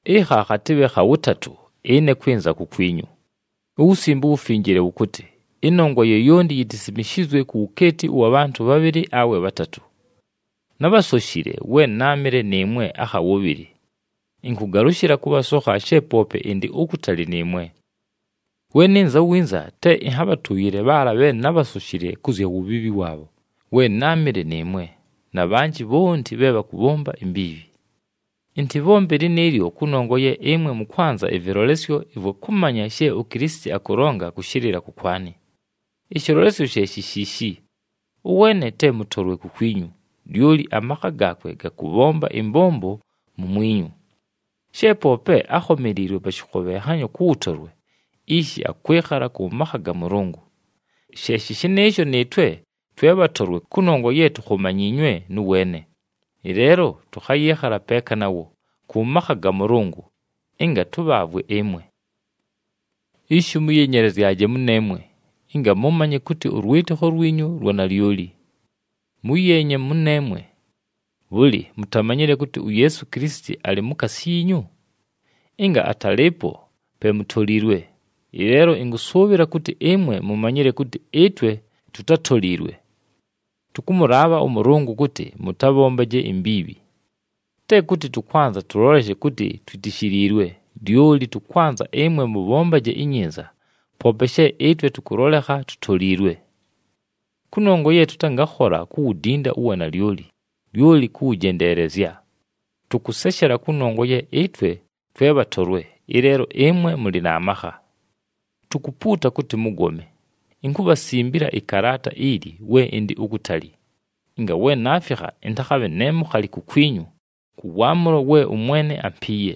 Ɨkha khatɨbhe kha wʉtatʉ ɨne kwɨnza kukwinyu. UWusimbe uWufinjile wʉkʉtɨ, “Ɨnongwa yoyonti yitisimishizwe ku wukeeti ʉwa bhantʉ bhabhɨlɨ awe bhatatʉ.” Nábhasoshile we náamɨle nɨɨmwe akha wʉbhɨlɨ. Ɨnkʉgalʉshɨla kʉbhasokha she poope ɨndɨ ukutali nɨɨmwe. We nɨnza winza, te ɨnhabhatʉʉyɨle bhaala bhe nábhasoshile kʉ zya wubhiibhi waabho we náamɨle nɨɨmwe, na bhanjɨ bhonti bhe bhakʉbhomba imbiibhi. Ɨntɨbhombe lɨnɨɨlyo kʉnongwa ye ɨmwe mʉkwanza ɨvɨlolesyo ɨvwa kʉmanya she uKilisiti akʉlonga kʉshɨlɨla kʉkwanɨ. Ɨshɨlolesyo she shi shiishi: ʉweene te mʉtolwe kukwinyu, lyoli amakha gaakwe gakʉbhomba ɨmbombo mumwinyu. She poope ákhomeliilwe pa shɨkhobhenhanyo kʉ wʉtolwe, ishi akwɨkhala kʉ makha ga Mʉlʉngʉ. She shɨnɨɨsho, nɨɨtwe twe bhatolwe kʉnongwa ye tukhomanyiinywe nʉ weene. Ɨleelo tʉkhayɨɨkhala peeka nawo, kʉ makha ga Mʉlʉngʉ ɨnga tʉbhaavwe ɨmwe. Ishi mʉyenyelezyaje mʉneemwe, ɨnga mʉmanye kʉtɨ ʉlwɨtɨkho lwinyu lwa nalyoli. Mʉyeenye mʉneemwe. Bhʉlɨ, mutamanyile kʉtɨ, uYeesu Kilisiti alɨ mukaasi yiinyu? Ɨnga atalɨɨpo, pe mutoliilwe. Ɨleelo ɨnkʉsʉʉbhɨla kʉtɨ ɨmwe mumanyile kʉtɨ ɨtwe tutátoliilwe. Tʉkʉmʉlaabha ʉMʉlʉngʉ kʉtɨ mʉtabhombaje imbiibhi. Te kʉtɨ tʉkwanza tʉloleshe kʉtɨ twitishiliilwe, lyoli tʉkwanza ɨmwe mʉbhombaje inyinza, poope she ɨtwe tʉkʉlolekha tutoliilwe. Kʉnongwa ye tʉtangakhola kuwudinda uwanalyoli, lyoli kʉwʉjendeelezya. Tʉkʉseshela kʉnongwa ye ɨtwe twe bhatolwe, ɨleelo ɨmwe mʉlɨ na makha. Tukupuuta kʉtɨ mʉgome. Inkubhasimbila ɨkalaata ili we ɨndɨ ukutali, ɨnga we naafikha ɨntakhabhe ne mukhali kukwinyu, kʉ waamʉlo we ʉMwene ampiiye.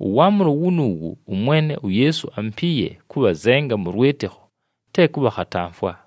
Ʉwaamʉlo wunuuwu ʉMwene uYeesu ampiiye kʉbhazenga mʉ lwɨtɨkho, te kʉbhakhatamfwa.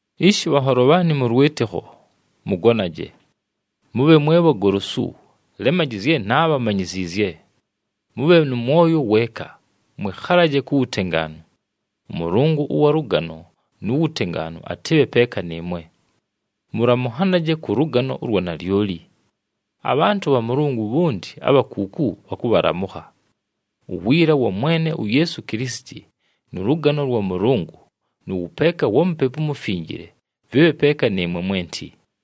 Ishi bhanholo bhaanɨ mʉ lwɨtɨkho, mʉgonaje. Mʉbhe mwe bhagolosu, lemaji zye naabhamanyiziizye. Mʉbhe nʉ mwoyo weeka, mwɨkhalaje ku wutengaanu. ɄMʉlʉngʉ ʉwa lʉgano nu wutengaanu atɨbhe peeka nɨɨmwe. Mʉlamʉnhanaje kʉ lʉgano ʉlwa nalyoli. Abhantʉ bha Mʉlʉngʉ bhonti abha kuuku bhakʉbhalamʉkha. Uwiila wa Mwene uYeesu Kilisiti, nʉ lʉgano lwa Mʉlʉngʉ, nʉ wʉpeeka wa Mupepu uMufinjile, vɨbhe peeka nɨɨmwe mwenti.